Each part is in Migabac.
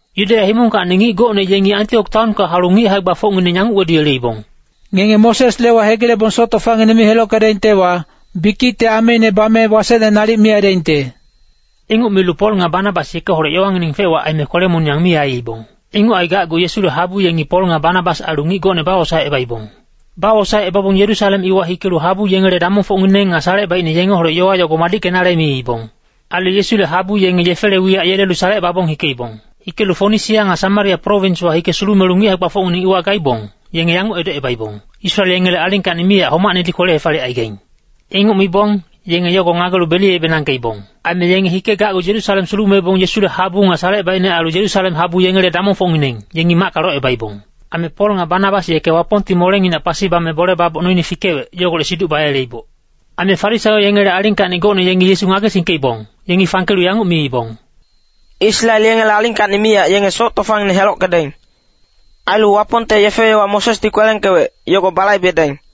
Yudeya himongkacni ngic gocne yengi Antiok taonka haulu ngic hae-gbafocngineng yanguc weduyeleibong, “Ngenge Mosesle yowa hegilebong soc tofangineng mi helockedaingtewa, bikicte ameine bame wasecne nalic mi aidaingte.” Inguc milu Pol nga Banabas yekeholec yowangineng fec-wac aime kwele-moniyang mi aiibong. Inguc aigacgu Yesule habu yengi Pol nga Banabas ailu ngic gocne bawosaecebaibong. Bawosaecebabong Yerusalem iwa hikelu habu yengele damongfocngineng nga salecebaicne yengeholec yowa yogo madickenale miibong. Ailu Yesule habu yenge yefele wiyac yelelu salecebabong hikeibong. Hikelu Fonisia nga Samaria prowinswa hike sulumelu ngic hae-gbafocngineng iwa gaibong, yenge yanguc edocebaibong, “Israel yengele alingkacni miyac homacnedi kwele-hefaliyec aigaing.” Inguc mibong, yenge yogo ngagelu beliyebenangkeibong. Aime yenge hikegacgu Yerusalem sulumebong Yesule habu nga salecebaicne ailu Yerusalem habu yengele damongfocngineng, yengi macka locebaibong. Aime Pol nga Banabas yeke Wapongti molenginac pasi bame bole baboc noine fikewec, yogolec siduc bayeleiboc. Aime Farisaio yengele alingkacni gocne yengi Yesu ngagesingkeibong, yengi fangkelu yanguc miibong, “Israel yengele alingkacni miyac yenge soc tofangineng helockedaing. Ailu Wapongte yefe-yowa Mosesdi kwelengkewec, yogo balaibedaing.”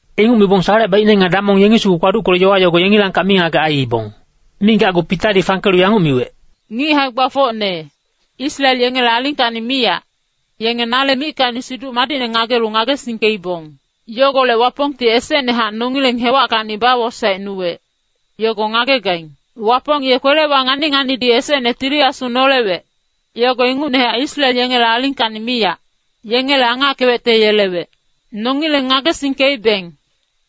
Inguc mibong salecebaicne nga damong yengi sugu kpaduckelu yowa yogo yengilangkac mingagec aiibong. Migacgu Pitadi fangkelu yanguc miwec, “Ngic hae-gbafocne, Israel yengele alingkacni miyac, yenge nale mickacni Siduc Madicne ngagelu ngagesingkeibong. Yogolec Wapongti esecnehac nongileng hewackacni bawosaecnuwec, yogo ngagegaing. Wapong ye kwelewa ngani-nganidi esecne Tili Asu nolewec, yogo ingucnehac Israel yengele alingkacni miyac, yengele angackewecte yelewec. Nongileng ngagesingkeibeng,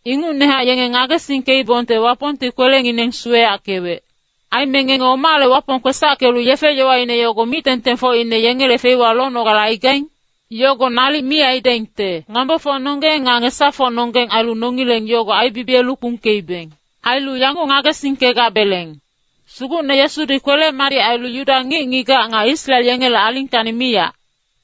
ingucnehac yenge ngagesingkeibongte Wapongti kwelengineng suweyackewec. Aime ngenge omale Wapong kwesackelu yefe-yowaine yogo mic-tengtengfocine yengele feiwa lonogale aigaing? Yogo nalic mi aidaingte. Ngambofocnonggeng nga ngesafocnonggeng ailu nongileng yogo aibibiyelu kpungkeibeng. Ailu yanguc ngagesingkegabeleng, ‘Sugucne Yesudi kwele-madic ailu Yuda ngic-ngigac nga Israel yengele alingkacni miyac,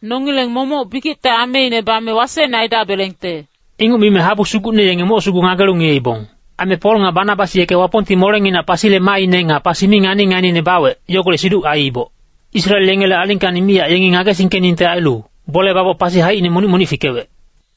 nongileng momoc bikicte ameine bame wasecne aidabelengte.’” Inguc mime habu sugucne yenge moc sugu ngagelu ngiyeibong. Aime Pol nga Banabas yeke Wapongti molenginac pasile maaine nga pasi mi ngani-nganiine bawec, yogolec siduc aiiboc. Israel yengele alingkacni miyac yengi ngagesingkeningte ailu, bole baboc pasi haicine monic-monic fikewec.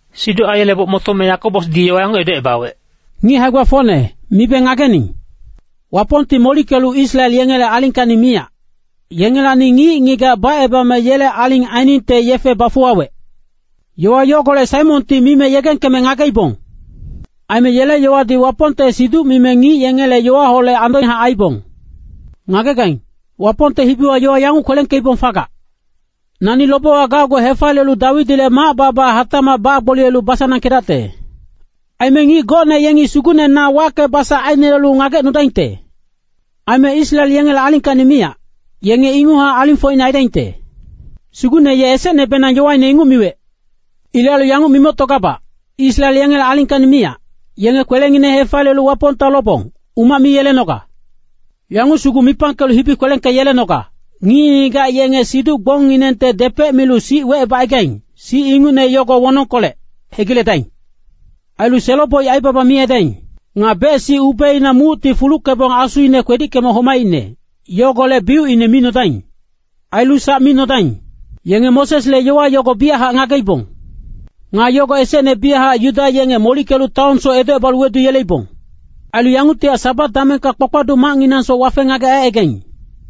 Siduc aiyeleboc motome Yakobosdi yowa yanguc edocebawec, “Ngic hae-gbafocne, mibe ngagening. Wapongti molickelu Israel yengele alingkacni miyac, yengelacni ngic-ngigac bacebame yele aling ainingte yefe bafuwawec. Yowa yogolec Saimonti mime yegengkeme ngageibong. Aime yele yowadi Wapongte siduc-mimi ngic yengele yowaholec andohac aiiboc. Ngagegaing, Wapongte hibiwa yowa yanguc kwelengkeibong fagac, ‘ “Nani lobewa gacgu hefaliyelu Dawidile mac-bala hatacmac bagboliyelu basanangkedacte. Aime ngic gocne yengi Sugucne na wacke-basac ainelelu ngagecnudaingte. Aime Israel yengele alingkacni miyac, yenge inguchac alingfocne aidaingte.” Sugucne ye esecnebenang yowaine inguc miwec.’ “Ilec ailu yanguc mimoctogabac, Israel yengele alingkacni miyac, yenge kwelengineng hefaliyelu Wapongta lobong, umac mi yelenoga. Yanguc sugu mipangkelu hibi kwelengkeyelenoga, ngic-ngigac yenge siduc-gbongnginengte depec milu sic wecebacaigaing, sic ingucne yogo wonongkolec, hegiledaing. Ailu selo-boic aibaba mi aidaing. Nga bec-sic ubeina mucti fuluckebong asuine kwedickeme homaicne, yogolec biucine mi nodaing. Ailu sac mi nodaing. Yenge Mosesle yowa yogo biyachac ngageibong. Nga yogo esecne biyachac Yuda yenge molickelu taonsoc edocebalu weduyeleibong. Ailu yanguctihac Sabat damengka kpakpaduc macnginangsoc wafe-ngagec aicaigaing.”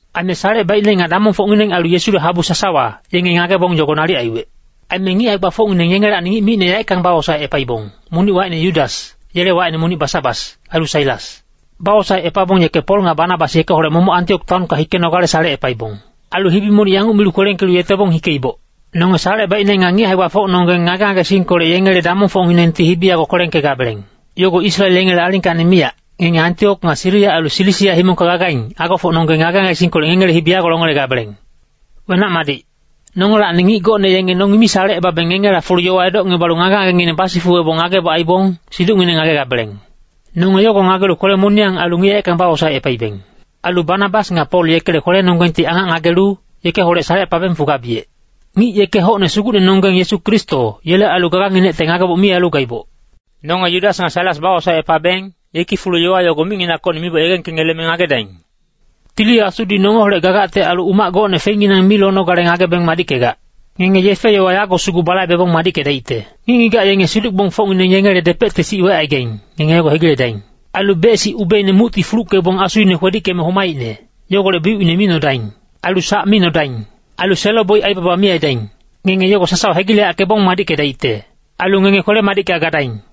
Aime salecebaicne nga damongfocngineng ailu Yesule habu sasawa, yenge ngagebong yogo nalic aiwec. Aime ngic hae-gbafocngineng yengelacni ngic micne yaeckang bawosaecepaibong, monic wacine Yudas, yele wacine monic Basabas, ailu Sailas. Bawosaecepabong yeke Pol nga Banabas yekeholec momoc Antiok taonka hikenogale salecepaibong. Ailu hibi monic yanguc milu kwelengkelu yetebong hikeiboc. Nonge salecebaicne nga ngic hae-gbafocnonggeng ngage-ngagesingkolec yengele damongfocnginengti hibi yago kwelengkegabeleng. Yogo Israel yengele alingkacni miyac, ngenge Antiok nga Siria ailu Silisia himongka gagaing, agofocnonggeng ngage-ngagesingkolec ngengele hibi yago longelegabeleng. Wenac-madic. Nongelacni ngic gocne yenge nongi mi salecebabeng ngengela fulu yowa edocngebalu ngage-ngagengineng basifuwebong ngageboc aibong, siducngineng ngagegabeleng. Nonge yogo ngagelu kwele-moniyang ailu ngic yaeckang bawosaecepaibeng. Ailu Banabas nga Pol yekele kwelenonggengti angac ngagelu, yekeholec salecepabeng fugabiyec. Ngic yeke hocne Sugucnenonggeng Yesu Kristo, yele ailu gaganginecte ngageboc mi ailu gaiboc. Nonge Yudas nga Sailas bawosaecepabeng, yeki fulu yowa yogo micnginackocni miboc yegengkengeleme ngagedaing. Tili Asudi nongeholec gagacte ailu umac gocne feinginang mi lonogale ngagebeng madickegac. Ngenge yefe-yowa yago sugu balaibebong madickedaicte. Ngic-ngigac yenge siduc-gbongfocngineng yengele depecte sic wecaigaing, ngenge yogo hegiledaing. Ailu bec-sic ubeina mucti fuluckebong asuine kwedickeme homaicne, yogolec biucine mi nodaing. Ailu sac mi nodaing. Ailu selo-boic aibaba mi aidaing. Ngenge yogo sasawa hegileyackebong madickedaicte. Ailu ngenge kwele-madicka gadaing.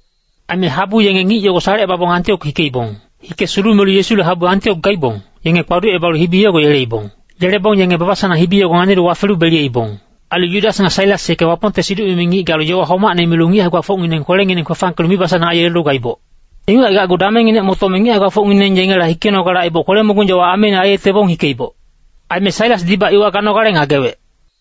Aime habu yenge ngic yogo salecebabong Antiok hikeibong. Hike sulumelu Yesule habu Antiok gaibong, yenge kpaducebalu hibi yogo yeleibong. Yelebong yenge baba-sanang hibi yogo nganilu wafelu beliyeibong. Ailu Yudas nga Sailas yeke Wapongte siduc-mimi ngic galu yowa homacne milu ngic hae-gbafocngineng kwelengineng kwefangkelu mibasanang aiyelelu gaiboc. Inguc aigacgu damengnginec motome ngic hae-gbafocngineng yengela hikenogale aiboc kwele-mogung yowa ameine aiyetebong hikeiboc. [Aime Sailasdibac iwa ganogale ngagewec.]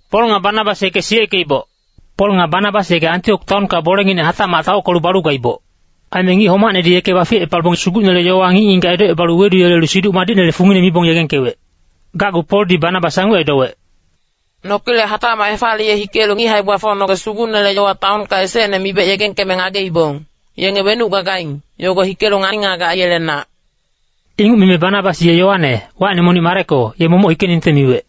Pol nga Banabas yeke Antiok taonka bolenginec hatacmac taockelu balu gaiboc. Aime ngic homacnedi yeke baficepabong Sugucnele yowa ngic-ngigac edocebalu weduyelelu Siduc Madicnele fungine mibong yegengkewec. Gacgu Poldi Banabas yanguc edowec, “Nokilec hatacmac hefaliye hikelu ngic hae-gbafocnonggec Sugucnele yowa taonka esecne mibec yegengkeme ngageibong, yenge wenuc gagaing, yogo hikelu ngani-ngagec aiyelenac.” Inguc mime Banabas ye Yoane, wacine monic Mareko, ye momoc hikeningte miwec.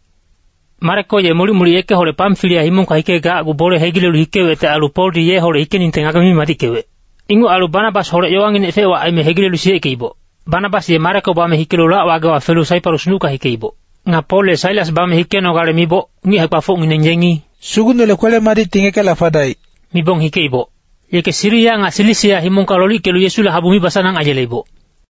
Mareko ye molic-molic yekeholec Pamfilia himongka hikecgu bole hegilelu hikewecte ailu Poldi yeholec hikeningte ngageme mi madickewec. Inguc ailu Banabasholec yowanginec fec-wac aime hegilelu siyeckeiboc. Banabas ye Mareko bame hikelu lac-wagewa felu Saiparus nucka hikeiboc. Nga Pol ye Sailas bame hikenogale miboc, ngic hae-gbafocngineng yengi “Sugucnele kwele-madicti ngekela fadaic” mibong hikeiboc. Yeke Siria nga Silisia himongka lolickelu Yesule habu mibasanang aiyeleiboc.